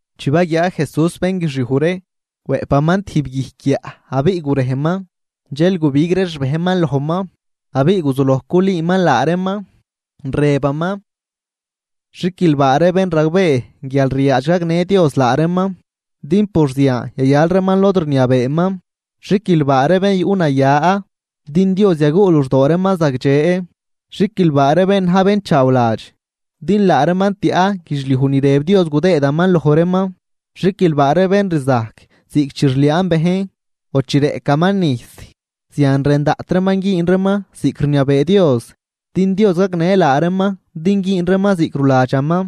Chi baguiaa Jesús bén guixiuj ree, wëꞌpaman tijb guijc guiaꞌ abiꞌ gurejman, dxel gubig ree xbejnman lojman. Abiꞌ guzuloj culüüman laa reeman, rëbaman: ―Xiquilbaa ree bén ragbee guial ryaadx gagnë Dios laa reeman, din por zian yayal reeman lod rniabeeman. ’Xiquilbaa ree bén yuꞌnaya, din Dios yaguꞌ luxdoo reeman zagdxe. ’Xiquilbaa ree bén na̱j bén chaawladx, din laa reeman tiaꞌ guidxliuj ni rëb Dios gudëëdaman loj reeman. ’Xiquilbaa ree bén rzajc ziꞌc chi rliaan bejn o chi reꞌcaman nijs zian rën daꞌt reeman güün reeman ziꞌc rniabee Dios, din Dios gagnë laa reeman din güün reeman ziꞌc ruladxaman.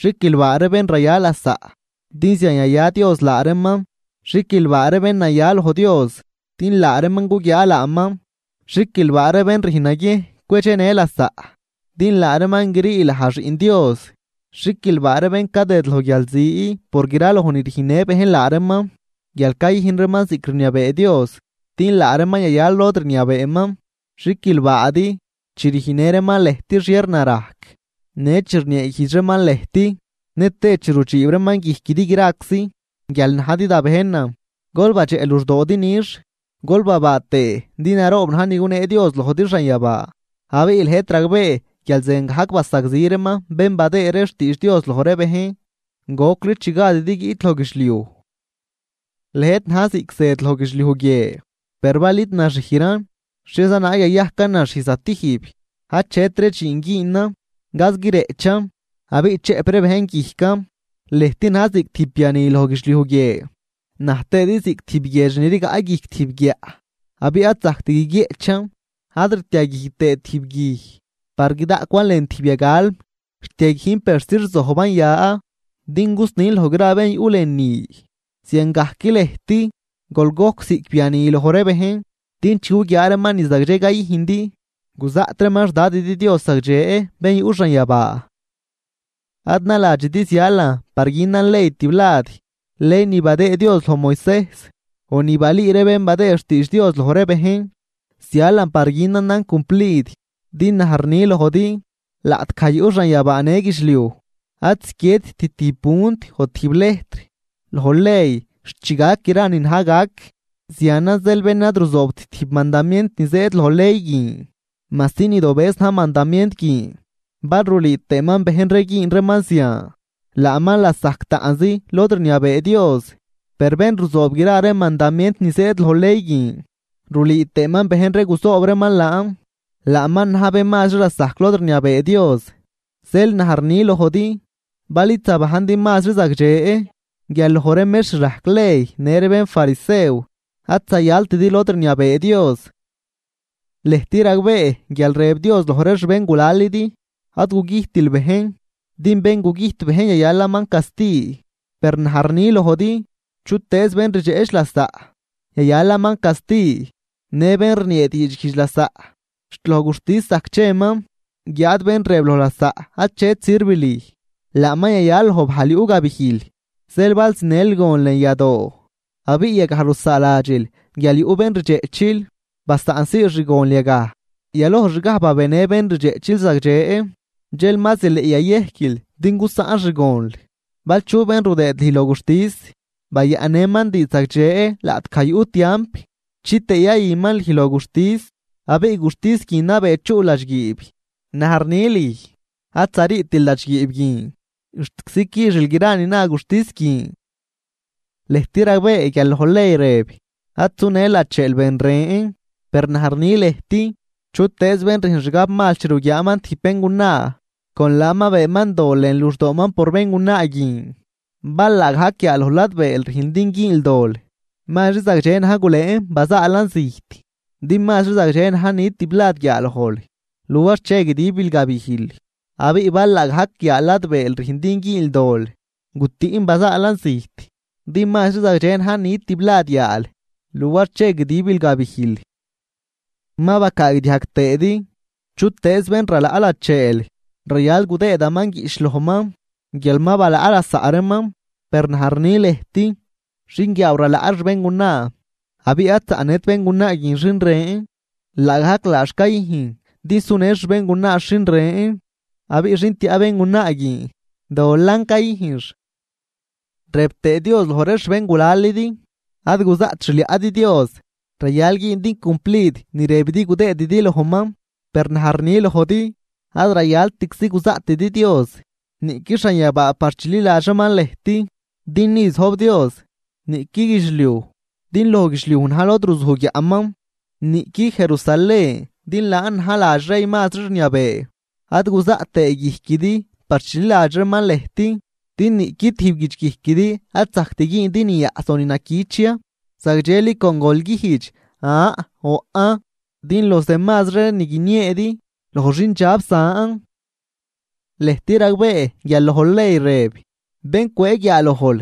’Xiquilbaa ree bén raya lasaꞌ, din zian yaya Dios laa reeman. ’Xiquilbaa ree bén naya loj Dios, din laa reeman guguiaa laaman. ’Xiquilbaa ree bén rüjn naguiejn cwedxenë lasaꞌ, din laa reeman grii laj xiꞌn Dios. ’Xiquilbaa ree bén cadëd loj guialzi por graloj ni rujnnë bejn laa reeman guial cayüjn reeman ziꞌc rniabee Dios, din laa reeman yayal lod rniabeeman. ’Xiquilbaadi, chi rüjnnë reeman lëjt xhiernarajc në chi rnieeguijdx reeman lëjt nëtëë chi rudxiib reeman guijquidi graczi, guial najdi da bejnan. Gol badxeꞌ luxdoodi nix, gol babaa tëë din naroob na̱j ni gunee Dios lojdi xanyabaa. Abiꞌ lëjt ragbee guial ziangajc basagzi reeman bén badëë ree xtiidx Dios loj ree bejn gocli chi gadidi guiꞌt loj guidxliuj. ’Lëjt na̱j ziꞌc zëd loj guidxliuj guie. Per bal id naxijran, ¿xhieza naag yayajcan naxij zatijb? Achetri dxiin güünan, gaz guireꞌchan abiꞌ chëꞌp ree bejn guijcan. ’Lëjt na̱j ziꞌc tijb biani loj guidxliuj guie, naj tëëdi ziꞌc tijb guiedx ni rigaꞌ tijb guijc guiaꞌ abiꞌ ad zajct guiguieꞌchan. Ad ritiaguij tëët tijb guij par guidaꞌcwan lën tijb yagalm, rtiaguijn persi rzojban ya din gusnin loj gra ree bén yuꞌ lënü. Ziangajc lëjt, gol gojc ziꞌc biani loj ree bejn, din chi guguiaa reeman ni zagdxe cayüjndi guzaꞌt reeman xDadidi Dios zagdxe bén yuꞌ xanyabaa. ’Ad naladxidi zialan par günan ley tiblad, ley ni badëë Dios loj Moisejs o ni balüü ree bén badëë xtiidx Dios loj ree bejn, zialan par günanan cumplid. Din naj rni lojdi, laꞌtgaj yuꞌ xanyabaa në guidxliuj, ad ziquiedt tijb punt o tijb lejtr loj ley xt chi gac gra ni na̱j gac. Zianan zeel bén ad ruzoobt tijb mandamient ni zëëd loj ley guin majsi nidobëz na̱j mandamient guin, bal rulüü tëëman bejn ree güün reeman zian, laaman lasajc taꞌnzi lod rniabee Dios. Per bén ruzoob gra ree mandamient ni zëëd loj ley guin, rulüü tëëman bejn ree guzoob reeman laan, laaman na̱j mazri bén lasajc lod rniabee Dios. Zeel naj rni lojdi, bal id zabajndi mazri zagdxe guial loj ree mextr rajc ley në ree bénfarisew, ad zayaltidi lod rniabee Dios. ’Lëjt ragbee guial rëb Dios loj ree xbéngulalidi: “Ad gugüjtil bejn, din bén gugüjt bejn yayalaman casti.” Per naj rni lojdi, chutëëz bén rdxeꞌchnë lasaꞌ, yayalaman casti, në bén rniee diidxguijdx lasaꞌ xt loj guxtis zajc cheman, guiáad bén rëb loj lasaꞌ achet sirv lüj, laaman yayal loj bajl yuꞌ gabijl. ’Zeel bal zinël gon lën yadoo abiꞌ yagaj rusaaladxil guial yuꞌ bén rdxeꞌchil, basaꞌnsii xgonl yagaj, yalojxgaj babenë bén rdxeꞌchil zagdxe, dxel ma zileꞌ yayejquil din gusaꞌn xgonl. ’Bal chu bén rudëed lüj loj guxtis, bayaꞌnnëman diidx zagdxe laꞌtgaj yuꞌ tiamp, chitëë yayüman lüj loj guxtis, abiꞌ guxtis guin nabee chuꞌl ladxguiib. Naj rni lüj, ad zariitil ladxguiib guin xtczi quixil gra ni na guxtis guin. ’Lëjt ragbee guial loj ley rëb: “Ad sunël lacheel ben ren.” Per naj rni lëjt, chutëëz bén rüjn xgabmal chi ruguiaaman tijb béngunaa, con laan ma beenman dol lën luxdooman por béngunaa guin. ’Bal laagajc guiaaloj ladbeel rüjn din güünl dol, mazri zagdxe na̱j gulëën bazaalan zijt. Din mazri zagdxe na̱j nit tiblad guiaalojl luar che guidibil gabijl. Abiꞌ bal laagajc yaa ladbeel rüjn din güünl dol, gutüꞌn bazaalan zijt. Din mazri zagdxe na̱j nit tiblad yaal luar che guidibil gabijl. ’Ma bacaagdiajg tëëdi: “Chutëëz bén ralaꞌ lacheel, rayal gudëëdaman guiꞌch lojman guial ma balaꞌ lasaꞌ reeman.” Per naj rni lëjt: Xinguiaaw ralaꞌ xbéngunaa, abiꞌ ad zaꞌnët béngunaa guin xin ren, laagajc laax cayüjn din sunë xbéngunaax xin ren. Abiꞌ xin tiaꞌ béngunaa guin dolan cayüjnx. ’Rëb tëë Dios loj ree xbéngulalidi: “Ad guzaꞌt xliaꞌdi Dios, rayal güündi cumplid ni rëbidi gudëëdidi lojman.” Per naj rni lojdi: Ad rayaltczi guzaꞌtidi Dios, niꞌqui xanyabaa par chililadx reeman lëjt din ni zojb Dios, niꞌqui guidxliuj din loj guidxliuj na̱j lod ruzuj guiaꞌman, niꞌqui Jerusalén din laan na̱j ladx rey mazri rniabee. Ad guzaꞌt tëë guijquidi par chililadx reeman lëjt, din niꞌqui tijb guidxguijquidi ad zajct güündi ni yaꞌs o ni naquich ya. Zagdxeli con gol güjdx “an” o “aꞌn”, din los demazri ree ni guinieedi loj xindxab zan. ’Lëjt ragbee guial loj ley rëb: “Bén cwëë guiaalojl,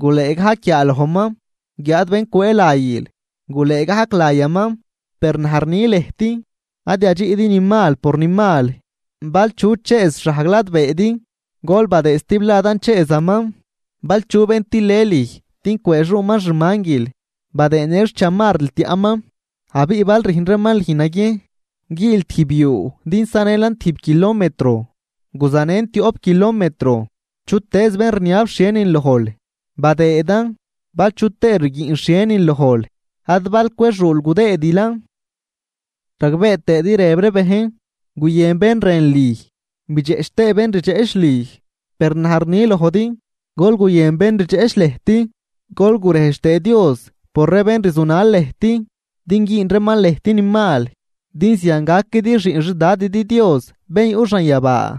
gulëë gajc guiaalojman. Guiáad bén cwëë layil, gulëë gajc layaman.” Per naj rni lëjt: Ad yadxiꞌdi ni mal por ni mal, bal chu chëëz xhajg ladbeedi, gol badëë stibladan chëëzaman. Bal chu bén tilë lüj din cwëëxuuman xmanguil, badëë në xchamarril tiaꞌman. Abiꞌ bal rüjn reeman lüj naguiejn güül tijb yuu din sanëlan tib kilometro, guzanën tioꞌp kilometro. Chutëëz bén rniab xhienin lojl, badëëdan, bal chu tëë rguiꞌn xhienin lojl ad bal cwexuul gudëëdilan. ’Ragbee tëëdi rëb ree bejn: “Guyën bén rën lüj, bidxeꞌch tëë bén rdxeꞌch lüj.” Per naj rni lojdi: Gol guyën bén rdxeꞌch lëjt, gol gurejdx tëë Dios por ree bén rzunal lëjt, din güün reeman lëjt ni mal. Din zian gaquidi xiꞌn xDadidi Dios bén yuꞌ xanyabaa,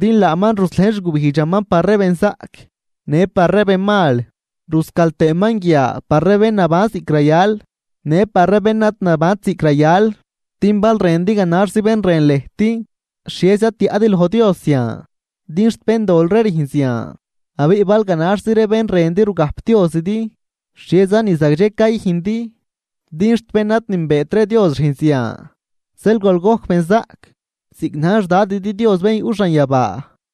din laaman ruslejn xgubijdxaman par ree benzaꞌc në par ree benmal, ruscal tëëman guia par ree bén naban ziꞌc rayal në par ree bén ad nabant ziꞌc rayal. Din bal rëndi ganaxzi bén rën lëjt, ¿xhieza tiaꞌdi loj Dios zian? Din xt béndol ree rüjn zian. Abiꞌ bal ganaxzi bén rëndi rugajpdiozidi, ¿xhieza ni zagdxe cayüjndi? Din xt bén ad nünbeet ree Dios rüjn zian. Zeel gol gojc benzaꞌc, ziꞌc na̱j xDadidi Dios bén yuꞌ xanyabaa.